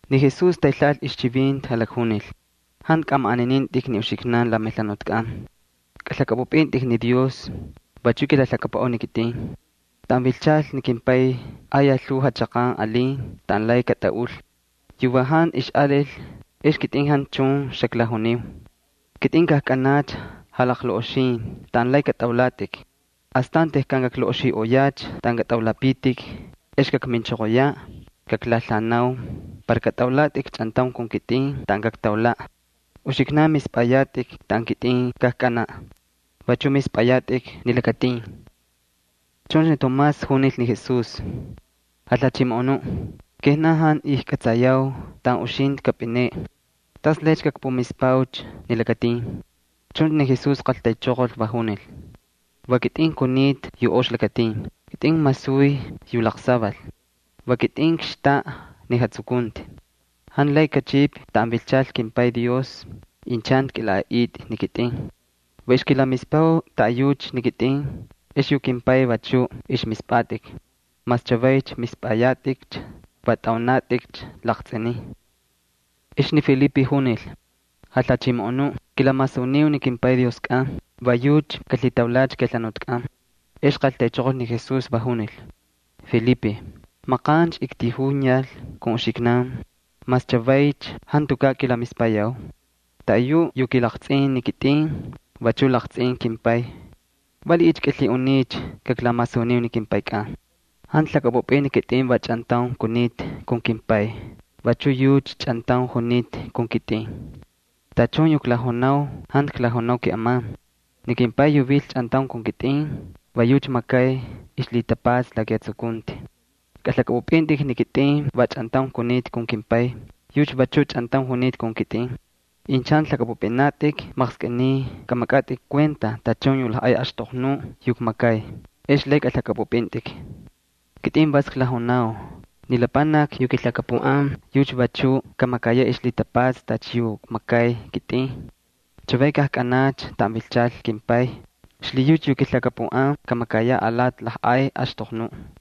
Ni Jesús taylhaꞌal ixchivinti, jalakjunil: —Jantu kꞌamaꞌaninintꞌik ni uxiknan la melhanutkꞌan, kꞌalhakꞌapꞌupꞌintꞌik ni Dios, vachu kilalhakapuꞌau ni kitꞌin. Taꞌan vilchal ni kimPay ayaj lhuu jachaqan alin taꞌan lay katꞌaꞌul. Yu va jantu ixꞌalil ex kitꞌin xaklajuniu. Kitꞌin kajkꞌanacha jalaqlaꞌoxin taꞌan lay katꞌaulatꞌik. Astan tejkan kaklaꞌoxiꞌoyacha taꞌan katꞌaulapitik ex kakminchoqoyaꞌ, kaklalhaꞌanau para katꞌaulatꞌik chꞌantaun kun kitꞌin taꞌan kaktaulaꞌ. Uxiknan mispꞌayatꞌik taꞌan kitꞌin kajkꞌanaꞌ, vachuꞌ mispꞌayatꞌik ni lakatin. Chuncha ni Tomás junil ni Jesús: —Jalhachimoꞌonuꞌ, kijnan jantu ijkꞌatsayau taꞌan uxintꞌi kapꞌineꞌe. ¿Tas lay kakpumispaucha ni lakatin? Chuncha ni Jesús qaltaychoqol, va junil: —Va kitꞌin kunita yu ox lakatin, va kitꞌin kmasuy yu laqsaval, va kitꞌin kxtaꞌa yu jatsukunti. Jantu lay kachꞌipꞌi taꞌan vilchal kimPay Dios incha jantu kꞌilaꞌaꞌitꞌi ni kitꞌin. Va ixkilamispau taꞌayucha ni kitꞌin ex yu kimPay vachu ixmispꞌatꞌik. Mas chavaycha mispꞌayatꞌikcha, va tꞌaunatꞌikcha laqtsꞌinin. Ex ni Felipe junil: —Jalhachimoꞌonuꞌ, kilamasuniu ni kimPay Dioskꞌan, va yucha kalhitaulacha kejalhuntkꞌan. Ex qaltaychoqol ni Jesús, va junil: —Felipe, maqancha ktijuyal kun uxiknan. ¿Mas chavaycha jantukaꞌ kilamispayau? Taꞌayuꞌ yu kilaqtsꞌin ni kitꞌin, vachu laqtsꞌin kimPay. ¿Valiꞌiycha kꞌilhiꞌuniycha kaklamasuniu ni kimPaykꞌan? ¿Jantu lhakꞌapꞌupꞌin ni kitꞌin va chꞌantaun kunita kun kimPay, vachu yucha chꞌantaun junita kun kitꞌin? Tachun yu klajunau jantu klajunau keꞌeman. Ni kimPay yu vil chꞌantaun kun kitꞌin va yucha makay ixlhitapatsa la kijatsukunti. Kꞌalhakꞌapꞌupꞌintꞌik ni kitꞌin va chꞌantaun kunita kun kimPay, yucha vachuꞌ chꞌantaun junita kun kitꞌin. Incha jantu lhakꞌapꞌupꞌinatꞌik, maqskꞌiniy kꞌamakꞌatꞌik kuenta tachun yu lajꞌay axtoqnuꞌ yu kmakay, ex lay kꞌalhakꞌapꞌupꞌintꞌik. Kitꞌin vas klajunau, ni lapanaki yu kilhakapuꞌan, yucha vachu kamakayaꞌ ixlhitapatsa tacha yu kmakay kitꞌin. Chavay kajkꞌanacha taꞌan vilchal kimPay, xlhiyucha yu kilhakapuꞌan kamakayaꞌ apalay lajꞌay axtoqnuꞌ.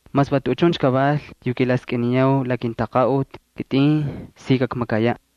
—Mas va tuꞌuchuncha kaval yu kilaskꞌiniyau la kintaqaꞌuti, kitꞌin si kakmakayaꞌ.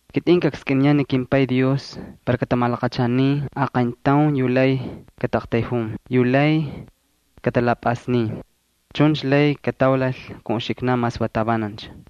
Kitꞌin kakskꞌiniyaꞌ ni kimPay Dios para katamalaqachanin aqayntaun yu lay kataꞌaqtayjun, yu lay katalapꞌasnin. Chuncha lay kataulal kun uxiknan mas va tavanancha.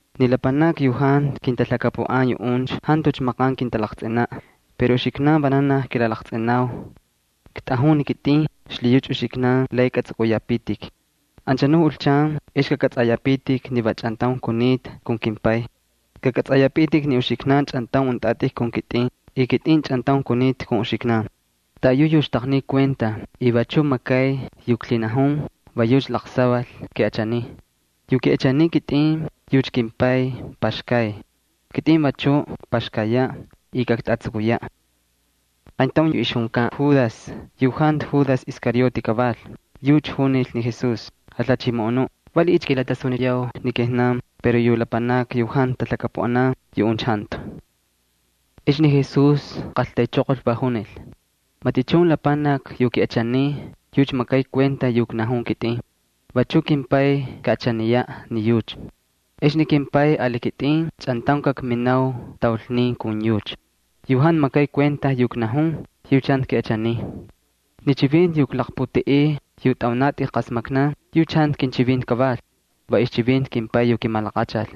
Ni lapanakni yu jantu kintalhakapuꞌan, yuꞌuncha jantucha maqan kintalaqtsꞌinaꞌ. Pero uxiknan vananaj kilalaqtsꞌinau. Ktꞌajun ni kitꞌin, xlhiyucha ni uxiknan lay katsꞌukꞌuyapitik. Anchanuꞌ julchan ex kakꞌatsꞌayapitik ni va chꞌantaun kunita kun kimPay. Kakꞌatsꞌayapitik ni uxiknan chꞌantaun untꞌatꞌik kun kitꞌin y kitꞌin chꞌantaun kunita kun uxiknan. Taꞌayu yu mispay kinchivinti y makay yu klhinajun, va yucha laqsaval kiꞌachaniy. Yu kiꞌachaniy ni kitꞌin, yucha kimPay paxkay. Kitꞌin vachu kakpaxkayaꞌ y kaktasuniyaꞌ. Qayntaun yu ixjunkan Judas, yu jantu Judas Iscariote kaval, yucha junil ni Jesús: —Jalhachimoꞌonuꞌ, ¿valiꞌiycha kilatasuniyaucha ni kijnan pero yu lapanakni yu jantu talhakapuꞌanan yuꞌuncha jantu? Ex ni Jesús qaltaychoqol, va junil: —Matichun lapanaki yu kiꞌachaniy, yucha makay kuenta yu knajun ni kitꞌin. Vachu kimPay kaꞌachaniyaꞌ ni yucha. Ex ni kimPay ali kitꞌin chꞌantaun kakminau taulnin kun yucha. Yu jantu makay kuenta yu knajun, yucha jantu kiꞌachaniy. Ni chivinti yu klaqputeꞌey yu tꞌaunatꞌik qasmaknan, yucha jantu kinchivinti kaval, va ixchivinti kimPay yu kimalaqachal.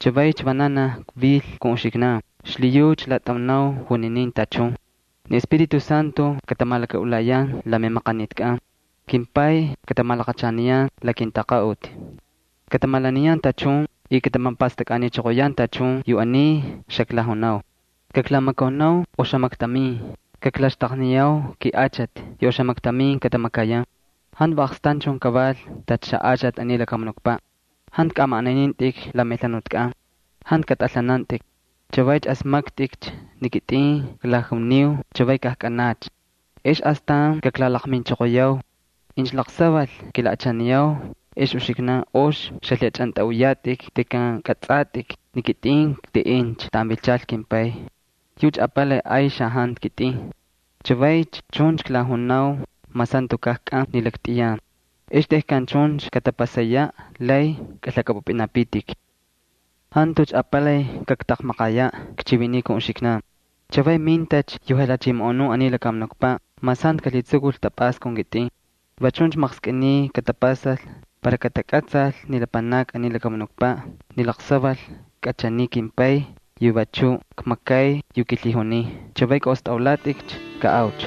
’Chavaycha vananaj kvil kun uxiknan, xlhiyucha klatꞌaunau juninin tachun. Ni Espíritu Santo katamalakaꞌulayan la memaqanitkꞌan. KimPay katamalaqachaniyan la kintaqaꞌuti. Katamalaniyan tachun y katamapastakniꞌochoqoyan tachun yu aniy xaklajunau. ’Kaklamakaunau oxamaktamin, kaklaxtaqniyau kiꞌachati yu oxamaktamin katamakayan. Jantu va aqstanchun kaval tacha xaꞌachati aniy lakamunukpaꞌ. Jantu kꞌamaꞌaninintꞌik la melhanutkꞌan, jantu katꞌalhanantꞌik. Chavay asmaktꞌikcha ni kitꞌin klajuniu chavay kajkꞌanacha ex astan kaklalaqminchoqoyau. Incha laqsaval kilaꞌachaniyau ex uxiknan ox xalhiꞌachꞌantꞌaꞌuyatꞌik tejkan kꞌatsꞌatꞌik ni kitꞌin kteꞌencha taꞌan vilchal kimPay. Yucha apalay ay xajantu kitꞌin. Chavaycha chuncha klajunau mas jantukaꞌ kꞌan ni laktꞌiyan. Ex tejkan chuncha katapasayaꞌ lay kꞌalhakꞌapꞌupꞌinapitik. ’Jantucha apalay kaktaqmaqayaꞌ chiviniꞌ kun uxiknan. Chavay mintacha yu jalhachimoꞌonuꞌ aniy lakamunukpaꞌ, mas jantu kalhitsukul tapꞌasta kun kitꞌin. Va chuncha maqskꞌiniy katapasal para katakꞌatsal ni lapanakni aniy lakamunukpaꞌ ni laqsaval kꞌachaniy kimPay y vachu kmakay yu kilhijuniy. ’Chavay kꞌaꞌostꞌalatꞌikcha, kaꞌaucha.